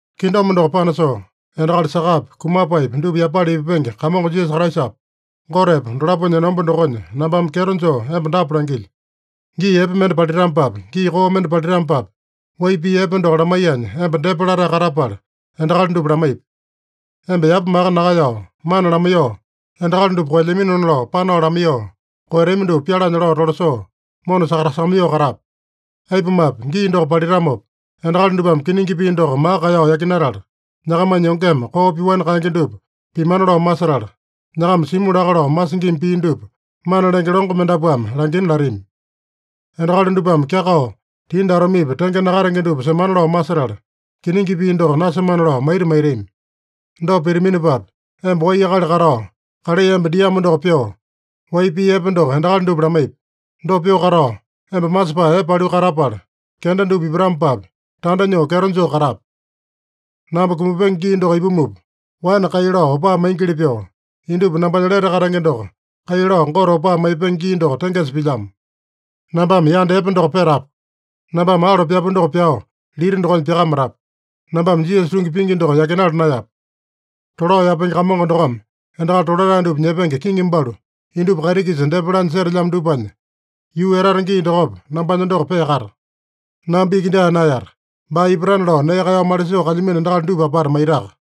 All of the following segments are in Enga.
Kingdom doko panasoo, endakali sakapi, kumapaepi dupa yapala ipupenge Kamongo Jisasa Kraisapa, Gotepa dolaponya enomba dokonya nambame kyeto joo emba dapa langilyo: Gii epe mende palitamopapi, gii koo mende palitamopapi, wai pii epe doko lamaiyanya emba depa latae katapala endakali dupa lamaipi. Emba yapa maka nakaeyao, mana lamaiyoo, endakali dupa koelyaminona lao panao lamaiyoo, koeyatami dupa pyalanya lao tolasoo, mona sakatasakamaiyoo katape. Aipumape, gii doko palitamopa, endakali dupame kiningi pii doko maka kaeyao yakinatala, nyakamanya yongeme koo pyoani kaenge dupa pimana lao masetala, nyakama simu laka lao masingima pii dupa mana lenge longo mendapuame langina latami. Endakali dupame kyakao, tindi atomepi tenge nakatenge dupa semana lao masetala, kiningi pii doko nasemana lao maita maitami. Dopa pitaminopapi, emba wai akali katao, kalai emba diamo doko pyoo, wai pii epe doko endakali dupa lamaipi. Dopa pyoo katao emba masepae epe paliu katapala, kenda dupa ipatamopapi, tanda nyoo kyeto joo katape. Namba kumapenge gii doko ipumupa, waene kai lao opaa maingili pyoo, indupa nambanya lete katenge doko kai lao Gote opaa maipenge gii doko tengesa pilyamo. Nambame yanda epe doko petapu. Nambame alo pyapu doko pyao lita dokonya pyakamatapu. Nambame Jisasa tungi pingi doko yakinala naeyapu. Tolao yapenge Kamongo dokome endakali tolatae dupa nyepenge kiŋi balu indupa kaiti-kisa depa lanya setelyamo dupanya, yuu etata gii dokopa nambanya doko peakata. Namba iki dyaa naeyata, baa ipatana lao nee kaeyao malisoo kalyamino endakali dupa apata maitaka.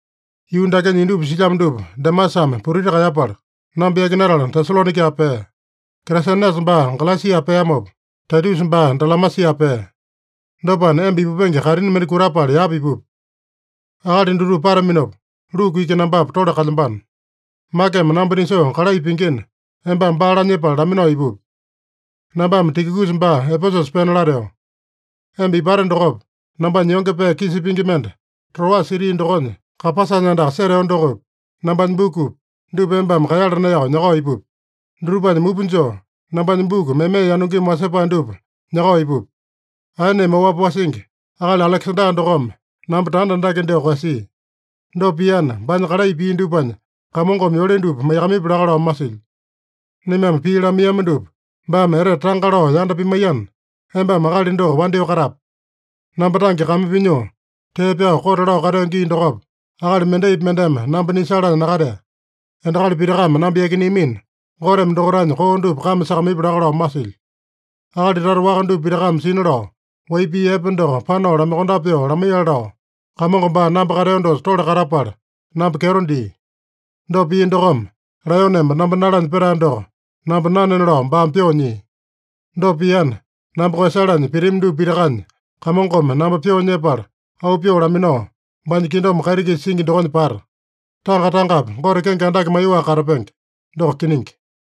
Yuu dakenya indupa silyamo dupa Demasame putiti kaeyapala, namba yakinatala Tesalonaika pea. Kresenesa baa Galesia peamopa, Taitusa baa Dalamasia pea. Dopana, emba ipupenge kaitini mende kutapala yapa ipupi. Akali dutupa pataminopa, Luku iki nambapa tole kalyambano. Makeme namba nisoo kalai pingina, embame baa lanyepala laminao ipupi. Nambame Tikikusa baa Epesusa pena lateo. Emba ipate dokopa, nambanya yonge pee kisa pingi mende, Troasa siti dokonya Kapasanya andaka seteo dokopi, nambanya bukupi, dupa embame kaeyala naeyao nyakao ipupi. Dutupanya mupa joo, nambanya buku meme yanungimi wasepae dupa nyakao ipupi. Aeneme oapi wasingi, akali Alekesanda dokome namba tanda andake dyoo koeyasia. Dopa piana, baanya kalai pia dupanya Kamongome yole dupa maiyakamaipya laka lao masilyo. Naimame pii lamaiyama dupa baame etete tanga lao yanda pimaiyana, embame akali doko wandyoo katape. Namba tange kame pinyoo, tee pyao kote lao kateo gii dokopa, akali mendaipi mendeme namba nisalanya nakatea. Endakali pitakame namba yakineamina, Goteme dokaitanya koo dupa kame sakamaipya laka lao masilyo. Akali tata waka dupa pitakame sina lao, wai pii epe doko panao lamaiyokondape pyoo lamaiyale lao, Kamongo baa namba kateo dosa tole katapala, namba kyeto dia. Dopa pia dokome, laeyoneme namba nalanya petae doko namba nanena lao baame pyoo nyia. Dopa piana, namba koeyasalanya pitami dupa pitakanya, Kamongome namba pyoo nyepala auu pyoo laminao, baanya kingdom kaiti-kisa singi dokonya pata. Tanga-tangapi Gote kenge andake maiyoaka katapenge. Doko kiningi.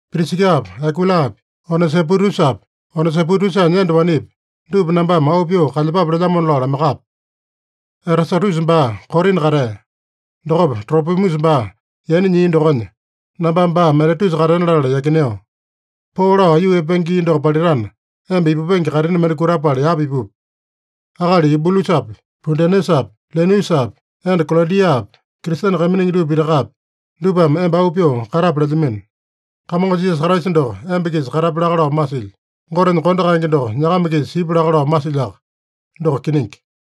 Prisikapi, Akuilapi, Onesipotusapi, Onesipotusanya enda wanepi, dupa nambame auu pyoo kalyepape lelyamona lao lamaiyakape. Erasatusa baa Korina katea. Dokopa Tropimusa baa yaina nyia dokonya, nambame baa Miletusa katena latala yakineo. Poo lao aiyuu epenge gii doko palitana, emba ipupenge kaitini mende kutapala yapa ipupi. Akali Yubulusapi, Pudenesapi, Linusapi, enda Kalodiapi, Kristene kaiminingi dupa pitakapi, dupame emba auu pyoo katape lelyamino. Kamongo Jisasa Kraisa doko emba-kisa katapya laka lao masilyo. Gotenya kondo kaenge doko nyakama-kisa sipya laka lao masilyoaka. Doko kiningi.